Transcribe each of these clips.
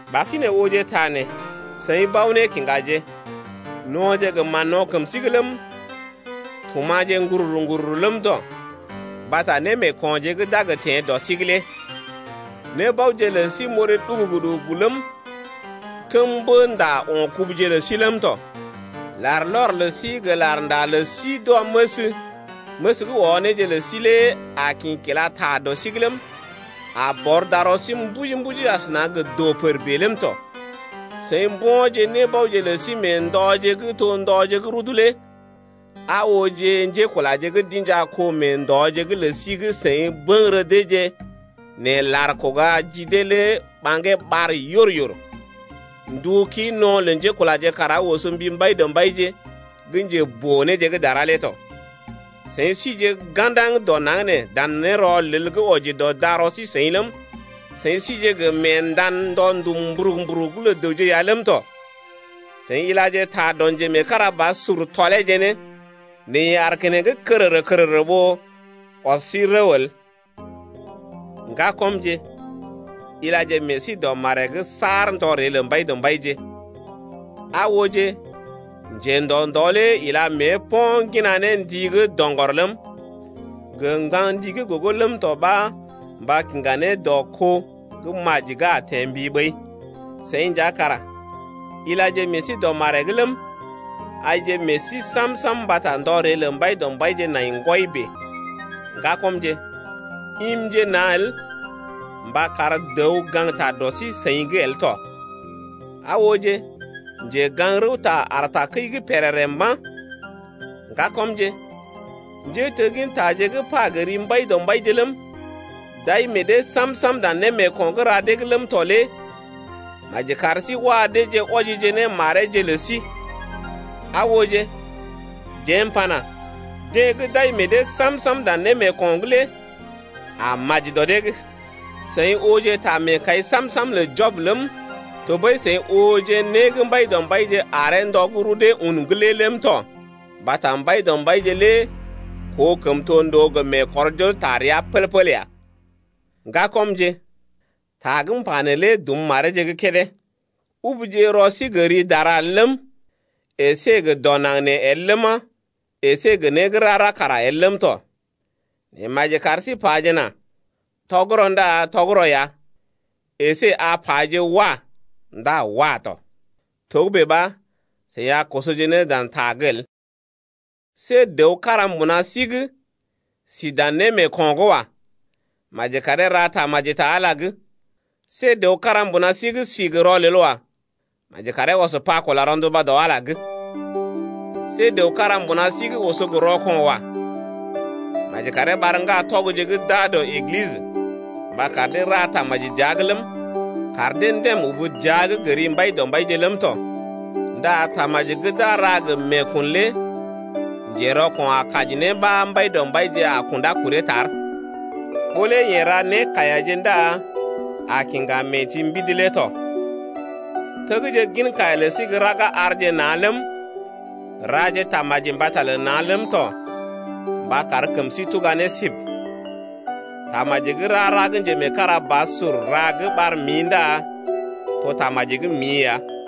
Ɓasinè ooje ta nee seḭ bao-nékiŋgaje: No̰je gə mán-no̰ kəm sí’g ləm, tuma̰je ŋgururu-ŋgururu ləm tɔ mbata némeekonje gə́ d’a gə teḛ dɔ sí’g lé. Nébaoje lə sí moré ɗugugu-ɗugugu ləm, kəm-mbə-nda o̰ kubuje lə sí ləm tɔ. Larlɔr lə sí gə larnda lə sí d’wɔməs, məs gə́ wɔ néje lə sí lé a kḭ kila ta dɔ sí’g ləm, a bɔr darɔ sí mbuji-mbuji asəna gə doo-pər bèe ləm tɔ. Seḭ mbo̰je nébaoje lə sí mee ndɔje gə́ to ndɔje gə́ rudu lé. Aa ooje, njékulaje gə́ d’inja kó mee ndɔje’g lə sí gə́ seḭ bəŋgərə deeje nɛ lar kuga ji dee lé ɓaŋgee ɓar yor-yor, ndu kii no̰ lə njékulaje kara oso mbi Mbaidɔmbaije gə́ njeboo-néje gə́ dara lé tɔ. Seḭ sije ga̰daŋ dɔ naŋg nee dan nérɔlel gə́ wɔji dɔ darɔ sí-seḭ ləm, seḭ sije gə meendan ndɔ ndum mburug-mburug lə dəwje ya ləm tɔ. Seḭ gə́ ilaje ta dɔ njemeekarabasur tɔleeje ne, nɛ yeḛ aar keneŋ kərərə-kərərə ɓó ɔs sí rəw el. Ŋgakɔmje, ilaje meḛ sí dɔ maree’g saar ndɔ ree lə Mbaidɔmbaije. Aa ooje, njendɔ ndɔ lé ila mée po̰ ŋgina ne ndi gə́ doŋgɔr ləm, gə ŋgaŋ ndi gə́ gogo ləm tɔ ɓa mba kiŋga ne dɔ kó gə́ maji gə́ a teḛ mbi ɓəi. Seḭ nja kara ilaje meḛ sí dɔ maree’g ləm, aije meḛ sí sam-sam mbata ndɔ ree lə Mbaidɔmbaije nai ŋgwɔi bèe. Ŋgakɔmje, imje na̰ el mba kar dəw gaŋgta dɔ sí-seḭ’g el tɔ. Aa ooje, njegaŋ-rəwta aar takəi’g pèrèrè mba̰. Ŋgakɔmje, njéteggintaje gə́ pa gə ri Mbaidɔmbaije ləm, d’ai meḛ dee sam-sam dan némeeko̰ gə́ ra dee’g ləm tɔ lé maji kar sí wa deeje wɔjije ne mareeje lə sí. Aa ooje, jeḛ m’pana: Deḛ gə́ d’ai meḛ dee sam-sam dan némeeko̰’g lé a maji dɔ dee’g. Seḭ ooje ta meekai sam-sam lə Jɔb ləm, tɔɓəi seḭ ooje né gə́ Mbaidɔmbaije aree ndɔ gə́ rudee un’g lé ləm tɔ mbata Mbaidɔmbaije lé koo kəmtondoo gə meekɔrjol taa rəa pəl-pəl ya. Ŋgakɔmje, ta gə́ m’pa neelé dum mareeje gə́ kédé: Ubuje rɔ sí gə ri dara el ləm, əsé gə dɔ naŋg nee el ləma, əsé gə né gə́ rara kara el ləm tɔ. Nɛ maji kar sí pajena: Tɔgərɔ ndá tɔgərɔ ya, əsé a paje: Wah! ndá wah tɔ. Togə́bè ɓa seḭ a kosoje ne dan ta’g el. See dəw kára mbuna sí’g sí dan némeeko̰’g wa. Maji karee ra tamaji ta Ala’g. See dəw kára mbuna sí’g sí gə rɔlel wa. Maji karee ɔs pa kula rɔnduba dɔ Ala’g lé. See dəw kára mbuna sí’g oso gə rɔko̰ wa. Maji karee ɓar ŋgatɔgje gə́ d’aa dɔ Eglisə mba kar dee ra tamaji dəa’g ləm, kar dee ndèm ubu dəa’g gə ri Mbaidɔmbaije ləm tɔ. Ndá tamaji gə́ d’a ra gə meekun lé njerɔko̰ a kaji ne ɓa Mbaidɔmbaije a kundá kuree tar, ɓó lé yeḛ ra nékaiyaje ndá a kiŋga mee-ti-mbidi lé tɔ. Tegje gin kaiya lə sí gə́ raga arje na̰ ləm, raje tamaji mbata lə na̰ ləm tɔ mba kar kəm sí tuga ne sib. Tamaji gə́ rara gə́ njemeekarabasur ra gə́ ɓar mḭ ndá to tamaji gə́ mḭ ya.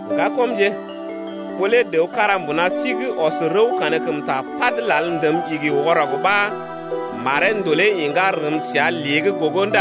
Ŋgakɔmje, ɓó lé dəw kára mbuna sí’g ɔs rəw kankəmta pad lal ndəm igi wɔrɔg ɓa maree ndolee iŋgá rəm səa lée’g gogo